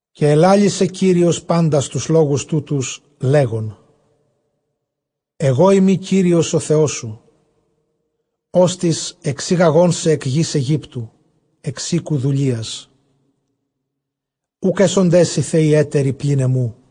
Καὶ ἐλάλησε Κύριος πάντας τοὺς λόγους τούτους, λέγων, ἐγώ εἰμι Κύριος ὁ Θεός σου, ὅστις ἐξήγαγόν σε ἐκ γῆς Αἰγύπτου, ἐξ οἴκου δουλείας. Οὐκ ἔσονταί σοι θεοὶ ἕτεροι πλὴν ἐμοῦ.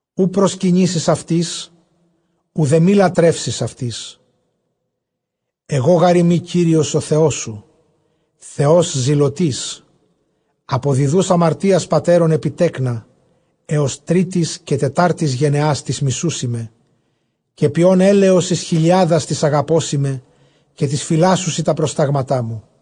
Οὐ προσκυνήσεις αὐτοῖς, οὐδὲ μὴ λατρεύσεις αὐτοῖς· ἐγὼ γάρ εἰμι Κύριος ὁ Θεός σου, Θεὸς ζηλωτὴς, ἀποδιδοὺς ἁμαρτίας πατέρων ἐπὶ τέκνα, ἕως τρίτης καὶ τετάρτης γενεᾶς τοῖς μισοῦσί με, καὶ ποιῶν ἔλεος εἰς χιλιάδας τοῖς ἀγαπῶσί με, καὶ τοῖς φυλάσσουσι τὰ προστάγματά μου.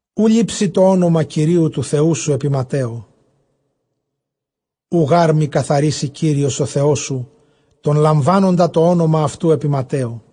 Οὐ λήψῃ τὸ ὄνομα Κυρίου τοῦ Θεοῦ σου ἐπὶ ματαίῳ· οὐ γὰρ μὴ καθαρίσῃ Κύριος ὁ Θεός σου τὸν λαμβάνοντα τὸ ὄνομα αὐτοῦ ἐπὶ ματαίῳ.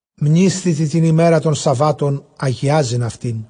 Μνήσθητι τὴν ἡμέραν τῶν σαββάτων ἁγιάζειν αὐτήν.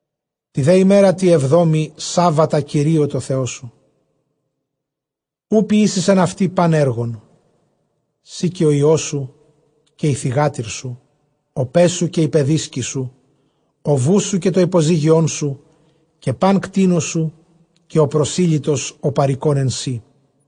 Τῇ δὲ ἡμέρᾳ τῇ ἑβδόμῃ, σάββατα Κυρίῳ τῷ Θεῷ σου· οὐ ποιήσεις ἐν αὐτῇ πᾶν ἔργον σὺ, καὶ ὁ υἱός σου, καὶ ἡ θυγάτηρ σου, ὁ παῖς σου, καὶ ἡ παιδίσκη σου, ὁ βοῦς σου, καὶ τὸ ὑποζύγιόν σου, καὶ πᾶν κτῆνός σου, καὶ ὁ προσήλυτος ὁ παροικῶν ἐν σοί.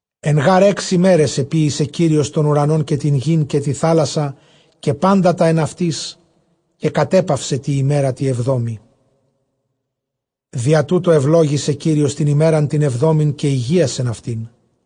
Ἐν γὰρ ἓξ ἡμέραις ἐποίησε Κύριος τὸν οὐρανὸν καὶ τὴν γῆν καὶ τὴν θὰλασσαν καὶ πάντα τὰ ἐν αὐτοῖς, καὶ κατέπαυσε τῇ ἡμέρᾳ τῇ ἑβδόμῃ· διὰ τοῦτο εὐλόγησε Κύριος τὴν ἡμέραν τὴν ἑβδόμην, καὶ ἡγίασεν αὐτήν.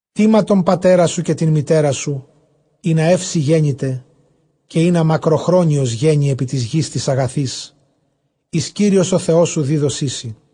Τίμα τὸν πατέρα σου, καὶ τὴν μητέρα σου, ἵνα εὖ σοι γένηται, καὶ ἵνα μακροχρόνιος γένῃ ἐπὶ τῆς γῆς τῆς ἀγαθῆς, ἧς Κύριος ὁ Θεός σου δίδωσί σοι.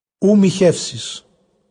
Οὐ μοιχεύσεις.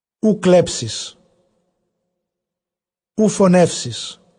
Οὐ κλέψεις. Οὐ φονεύσεις.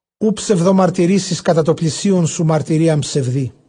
Οὐ ψευδομαρτυρήσεις κατὰ τοῦ πλησίον σου μαρτυρίαν ψευδῆ.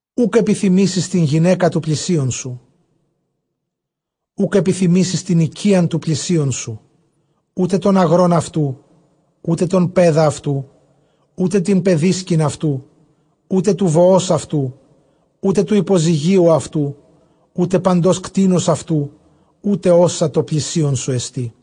Οὐκ ἐπιθυμήσεις τὴν γυναῖκα τοῦ πλησίον σου· οὐκ ἐπιθυμήσεις τὴν οἰκίαν τοῦ πλησίον σου, οὔτε τὸν ἀγρὸν αὐτοῦ, οὔτε τὸν παῖδα αὐτοῦ, οὔτε τὴν παιδίσκην αὐτοῦ, οὔτε τοῦ βοὸς αὐτοῦ, οὔτε τοῦ ὑποζυγίου αὐτοῦ, οὔτε παντὸς κτήνους αὐτοῦ, οὔτε ὅσα τῷ πλησίον σου ἐστί.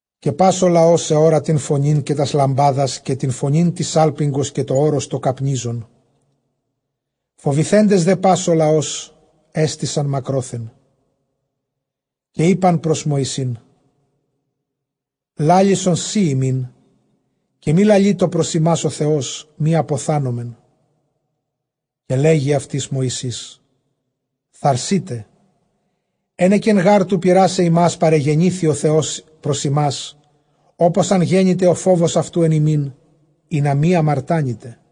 Καὶ πᾶς ὁ λαὸς ἑώρα τὴν φωνὴν, καὶ τὰς λαμπάδας, καὶ τὴν φωνὴν τῆς σάλπιγγος, καὶ τὸ ὄρος τὸ καπνίζον· φοβηθέντες δὲ πᾶς ὁ λαὸς ἔστησαν μακρόθεν. Καὶ εἶπαν πρὸς Μωυσῆν, λάλησον σὺ ἡμῖν, καὶ μὴ λαλείτω πρὸς ἡμᾶς ὁ Θεὸς, μὴ ἀποθάνωμεν. Καὶ λέγει αὐτοῖς Μωυσῆς, θαρσεῖτε· ἕνεκεν γὰρ τοῦ πειράσαι ὑμᾶς παρεγενήθη ὁ Θεὸς πρὸς ὑμᾶς, ὅπως ἂν γένηται ὁ φόβος αὐτοῦ ἐν ὑμῖν, ἵνα μὴ ἁμαρτάνητε.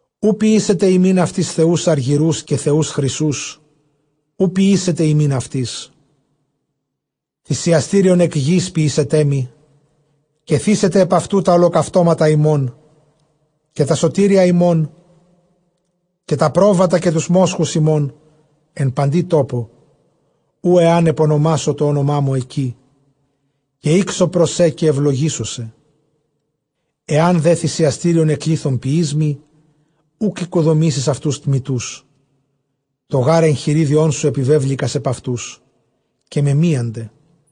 Οὐ ποιήσετε ὑμῖν αὐτοῖς θεοὺς ἀργυροῦς, καὶ θεοὺς χρυσοῦς οὐ ποιήσετε ὑμῖν αὑτοῖς. Θυσιαστήριον ἐκ γῆς ποιήσετέ μοι, καὶ θύσετε ἐπʼ αὐτοῦ τὰ ὁλοκαυτώματα ὑμῶν, καὶ τὰ σωτήρια ὑμῶν, καὶ τὰ πρόβατα, καὶ τοὺς μόσχους ὑμῶν ἐν παντὶ τόπῳ, οὗ ἐὰν ἐπονομάσω τὸ ὄνομά μου ἐκεῖ, καὶ ἥξω πρὸς σὲ, καὶ εὐλογήσω σε. Ἐὰν δὲ θυσιαστήριον ἐκ λίθων ποιῇς μοι, οὐκ οἰκοδομήσεις αὐτοὺς τμητούς· τὸ γὰρ ἐγχειρίδιόν σου ἐπιβέβληκας ἐπʼ αὐτοὺς, καὶ μεμίανται.